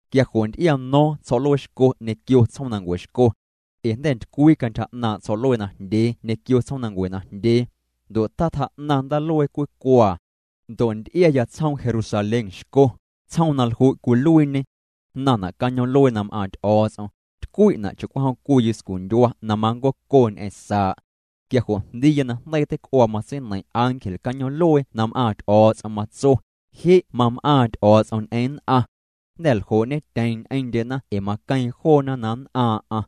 Quia jo' nty'iano̱o̱ⁿ tsjo̱'luee xco ñequio tsjoomnancue xco. Ee jnda̱ ntycwii cantyja 'naaⁿ' tsjo̱'luee najndyee ñequio tsjoomnancue najndyee. Ndo' tatjaa'naⁿ ndaaluee cwii cuaa. Ndo' nty'iaya tsjoom Jerusalén xco, tsjoom na lju' cwiluiiñe. Jnaⁿna' cañoom'luee na m'aaⁿ Ty'o̱o̱ts'om, tycwi'na' cha'cwijom cwii yuscundyua na manncoco ñ'eⁿ saa'. Quia jo' jndiiya na jndeii teic'uaa matseineiⁿ ángel cañoom'luee na m'aaⁿ Ty'o̱o̱ts'om, matso: —Je' mam'aaⁿ Ty'o̱o̱ts'om ñ'eⁿ nn'aⁿ. Jnda̱ ljoo'ñetyeeⁿ ñ'eⁿndyena ee maqueeⁿ joona na nn'aaⁿ'aⁿ.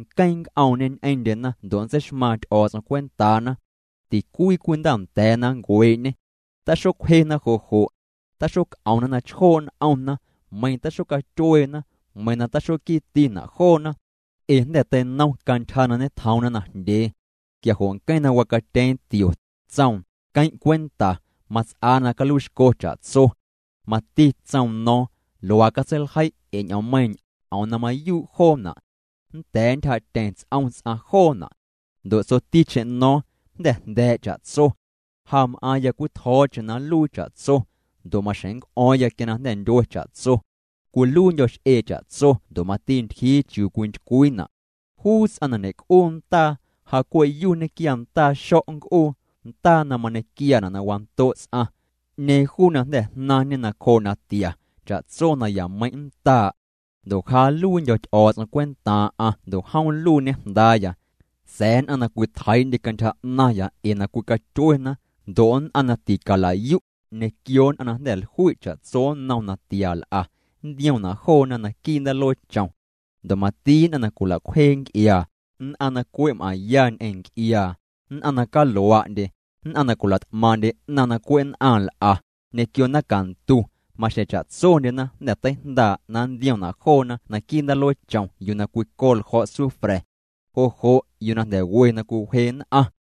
Nqueⁿ nnc'oomñê ñ'eⁿndyena ndo' nntseixmaaⁿ Ty'o̱o̱ts'om cwentaana. Ticwii cwii ndaanda̱a̱na nncuee'ñê. Taxocwjena jo' jo'. Taxoc'omna na chjoo' n'omna, meiⁿ taxocatyueena, meiⁿ na taxoquiitina' joona. Ee jnda̱ teinom cantyja na ñetjoomna najndyee. Quia jo' nqueⁿ na wacatyeeⁿ tio, tsoom: —Queⁿ' cwenta, mats'aa na caluiixco cha'tso. Mati tsoom no̱o̱ⁿ: —Luaa catseiljei' ee ñ'oommeiiⁿ, ñ'oom na mayuu' joona'. Nnda̱a̱ ntyjaa'tyeⁿ ts'om ts'aⁿ joona'. Ndo' tsoticheⁿ no̱o̱ⁿ: —Jnda̱ jnda̱a̱' cha'tso. Ja m'aaⁿya cwii tjo̱o̱cheⁿ na nluii cha'tso, ndo' maxjeⁿ nnc'o̱o̱ⁿya quia na jnda̱ ntyue cha'tso. Cwiluiindyo̱ x'e cha'tso ndo' mati ntyjii chiuu cwintycwiina'. Juu ts'aⁿ na ñe'c'uu ndaa, ja cwe' yuu nñequia ndaa xo̱' nc'uu, ndaa na mañequiaana' na wando' ts'aⁿ. 'Ñeeⁿ juu na jnda̱ jnaⁿñe nacjoo' natia, cha'tso nayameiⁿ' nndaa'. Ndo' ja nluiindyo̱ Ty'o̱o̱ts'om cwentaaⁿ'aⁿ ndo' jom nluiiñê jndaaya. Sa̱a̱ nn'aⁿ na cwitjeii'ndye cantyja 'naⁿya ee na cwicatyuena, ndo' nn'aⁿ na ticala'yu', ñequio nn'aⁿ na jnda̱ jlui' cha'tso nnom natia l'a, nntiomna' joona naquii' ndaalueechom. Ndo' mati nn'aⁿ na cwila'cwjee nc'iaa, nn'aⁿ na cwe' m'aⁿya ñ'eⁿ nc'iaa, nn'aⁿ na calua'ndye, nn'aⁿ na cwila't'maaⁿ'ndye 'naⁿ na cwe' nn'aⁿ nl'a, ñequio naⁿcantu, maxjeⁿ cha'tsondyena jnda̱ teijndaa' na nntiomna' joona naquii' ndaalueechom na cwico ljo̱' sufra̱. Jo' jo' yuu na jnda̱ we na cwiwje nn'aⁿ.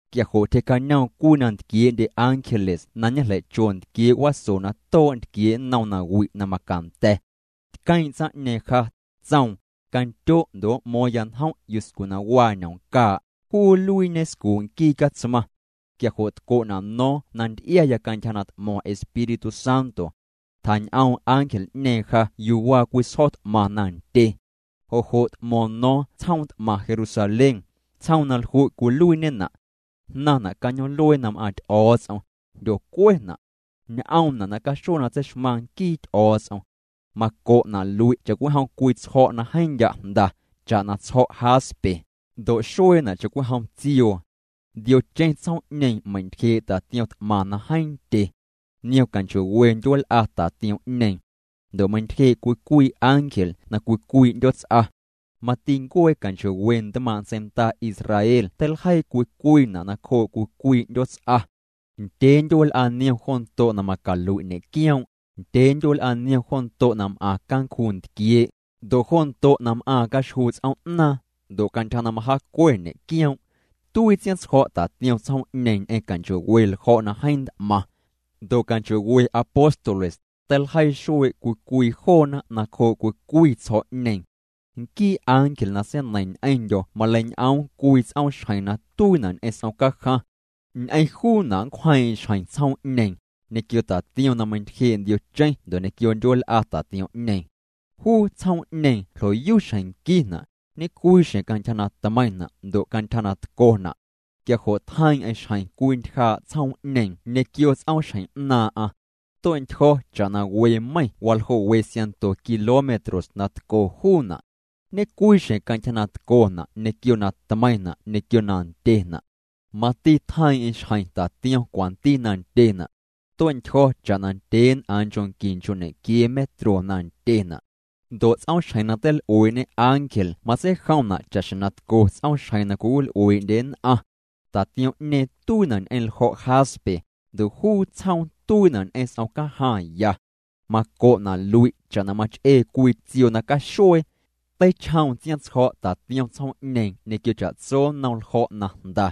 Quia jo' tyjee'cañoom cwii na ntquiee'ndye ángeles na ñejleicho ntquiee' waso na too' ntquiee' nnom nawi' na macanda̱. Tqueeⁿ' tsaⁿ'ñeeⁿ ja, tsoom: —Candyo' ndo' m'mo̱o̱ⁿya njom' yuscu na waa ñomcaa', juu nluiiñe scuu' nquii Catsmaⁿ. Quia jo' tco'na' no̱o̱ⁿ na nty'iaya cantyja na t'mo̱ⁿ Espíritu Santo. Tjañ'oom ángel'ñeeⁿ ja yuu waa cwii sjo̱ t'maⁿ na ndye. Jo' jo' t'mo̱ⁿ no̱o̱ⁿ tsjoom t'maⁿ Jerusalén, tsjoom na lju' cwiluiiñena'. Jnaⁿna' cañoom'luee na m'aaⁿ Ty'o̱o̱ts'om, jndyocuena'. Ñ'oomna' nacaxuee na tseixmaⁿ nquii Ty'o̱o̱ts'om. Maco'na' lui' cha'cwijom cwii tsjo̱' na jeeⁿ ndya' jnda, cha'na tsjo̱' jaspe, ndo' xueena' cha'cwijom tsioo. Ndiocheⁿ tsjoom'ñeeⁿ meintyjee' tatiom t'maⁿ na jeeⁿ ndye. Niom canchoo'we ndyueel'a tatiom'ñeeⁿ, ndo' meintyjee' cwii cwii ángel na cwii cwii 'ndyoots'a. Mati ncuee canchoo'we ntmaaⁿ' ntseinda Israel teiljeii cwii cwiina' nacjoo' cwii cwii 'ndyoots'a. Ndyee ndyueel'a niom jo ndo' na macalui' ñe'quioom', ndyee ndyuel'a niom jo ndo' na m'aⁿ cancjuu ntquiee', ndo' jo ndo' na m'aaⁿ caxjuu tsoom'naaⁿ, ndo' cantyja na majaacue ñe'quioom'. Tuii tsiaⁿtsjo̱' tatiom tsjoom'ñeeⁿ ñ'eⁿ canchoo'we ljo̱' na jeeⁿ nt'maⁿ. Ndo' canchoo'we apóstoles, teiljeii xuee' cwii cwii joona nacjoo' cwii cwii tsjo̱'ñeeⁿ. Nquii ángel na seineiⁿ ñ'eⁿndyo̱ maleiñ'oom cwii ts'oomxjeⁿ na tuiina' ñ'eⁿ s'om cajaⁿ. Ñ'eⁿ juuna' nncwjeeⁿ'eⁿ xjeⁿ tsjoom'ñeeⁿ, ñequio tatiom na meintyjee' ndiocheⁿ ndo' ñequio ndyueel'a tatiom'ñeeⁿ. Juu tsjoom'ñeeⁿ ljo'yu xjeⁿ nquina', ñe'cwii xjeⁿ cantyja na tmeiⁿna' ndo' cantyja na tcona'. Quia jo' tjeiiⁿ'eⁿ xjeⁿ cwii ntyjaa' tsjoom'ñeeⁿ ñequio ts'oomxjeⁿ 'naaⁿ'aⁿ. Tue'ntyjo̱ cha'na we meiⁿ waljoo' we siaⁿnto kilómetros na tco juuna'. Ñe'cwii xjeⁿ cantyja na tcona' ñequio na tmeiⁿna' ñequio na ndyena'. Mati tjeiiⁿ'eⁿ xjeⁿ tatiom cwanti na ndyena'. Tue'ntyjo̱ cha'na ndyeen'aaⁿ nchoo' qui nchoo' ñequiee metros na ndyena'. Ndo' ts'oomxjeⁿ na teil'uee'ñe ángel matseijomna' cha'xjeⁿ na tco ts'oomxjeⁿ na cwiwil'uee'ndye nn'aⁿ. Tatiom'ñeeⁿ tuiina' ñ'eⁿ ljo̱' jaspe, ndo' juu tsjoom tuiina' ñ'eⁿ s'omcajaⁿ ya. Maco'na' lui' cha'na mach'ee cwii tsioo na caxuee. Teichjoom tsiaⁿtsjo̱' tatiom tsjoom'ñeeⁿ ñequio cha'tso nnom ljo̱' na jnda.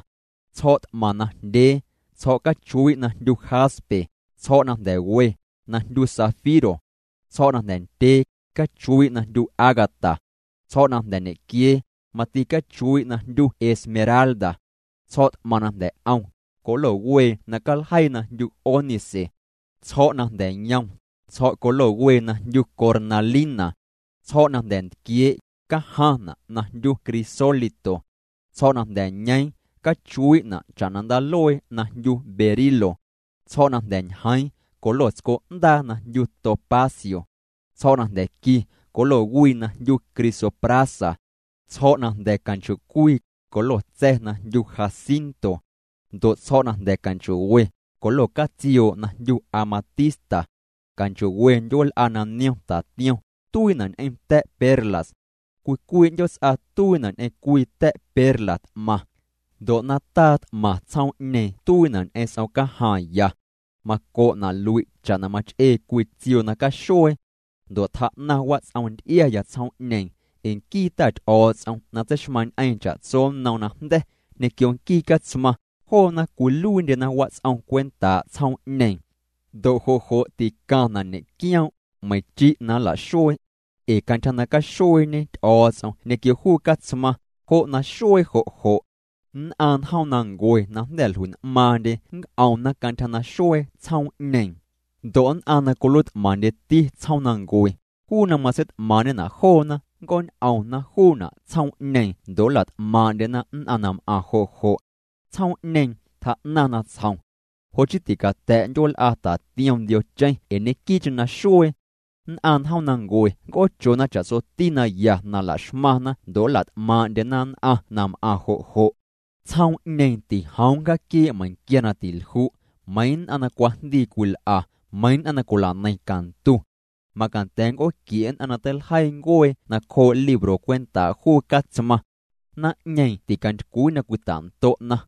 Tsjo̱' t'maⁿ najndyee, tsjo̱' cachuii' na jndyu jaspe, tsjo̱' na jnda̱ we, na jndyu zafiro. Tsjo̱' na jnda̱ ndyee, cachuii' na jndyu ágata. Tsjo̱' na jnda̱ ñequiee, mati cachuii' na jndyu esmeralda. Tsjo̱' t'maⁿ na jnda̱ 'om, colo wee na caljeii na jndyu ónice. Tsjo̱' na jnda̱ yom, tsjo̱' wee na jndyu cornalina. Tsjo̱' na jnda̱ ntquiee', cajaⁿna' na jndyu crisólito. Tsjo̱' na jnda̱ ñeeⁿ, cachuii'na' cha'na ndaaluee na jndyu berilo. Tsjo̱' na jnda̱ ñjeeⁿ, colo tsco'ndaa na jndyu topacio. Tsjo̱' na jnda̱ nqui, colo wii na jndyu crisoprasa. Tsjo̱' na jnda̱ canchoo'cwii, colo tsa̱ na jndyu jacinto. Ndo' tsjo̱' na jnda̱ canchoo'we, colo catsioo' na jndyu amatista. Canchoo'we ndyueel'a na niom tatiom, tuiina' ñ'eⁿ ta̱' perlas. Cwii cwii 'ndyoots'a tuiina' ñ'eⁿ cwii ta̱' perla t'maⁿ. Ndo' nataa t'maⁿ tsjoom'ñeeⁿ tuiina' ñ'eⁿ s'omcajaⁿ ya. Maco'na' lui' cha'na mach'ee cwii tsioo na caxuee. Ndo' tjaa'naⁿ wats'om nty'iaya tsjoom'ñeeⁿ, ee nquii Ta Ty'o̱o̱ts'om na tseixmaⁿñ'eeⁿ cha'tso nnom najnda̱, ñequio nquii Catsmaⁿ, joona cwiluiindyena wats'om cwentaa' tsjoom'ñeeⁿ. Ndo' jo' jo' ticaⁿna' ñe'quioom', meiⁿ chi' na nla'xuee. Ee cantyja na caxueeñe Ty'o̱o̱ts'om ñequio juu Catsmaⁿ, jo' naxuee jo' jo'. Nn'aⁿ njoomnancue na jnda̱ jlui'n'maaⁿndye nnc'omna cantyja naxuee tsjoom'ñeeⁿ. Ndo' nn'aⁿ na cwiluiit'maⁿndyeti tsjoomnancue, juu na matseit'maaⁿ'ñena' joona, nnc'oon'omna juuna' tsjoom'ñeeⁿ ndo' nla't'maaⁿ'ndyena nn'aⁿ na m'aⁿ jo' jo'. Tsjoom'ñeeⁿ tjaa'naⁿ natsjom. Jo' chii ticata̱' ndyueel'a tatiom ndiocheⁿ ee ñeⁿnquii'cheⁿ naxuee. Nn'aⁿ njoomnancue nnc'oochona cha'tsoti na ya na la'xmaⁿna ndo' nla't'maaⁿ'ndyena nn'aⁿ na m'aⁿ jo' jo'. Tsjoom'ñeeⁿ tijoom nncjaaquiee' meiⁿnquia na tilju', meiⁿ nn'aⁿ na cwajndii cwil'a, meiⁿ nn'aⁿ na cwila'neiⁿ cantu. Macanda̱ nnc'ooquie' nn'aⁿ na teiljeii ncuee nacjoo' libro cwentaa' juu Catsmaⁿ. Naⁿ'ñeeⁿ ticantycwii na cwita'ndo'na.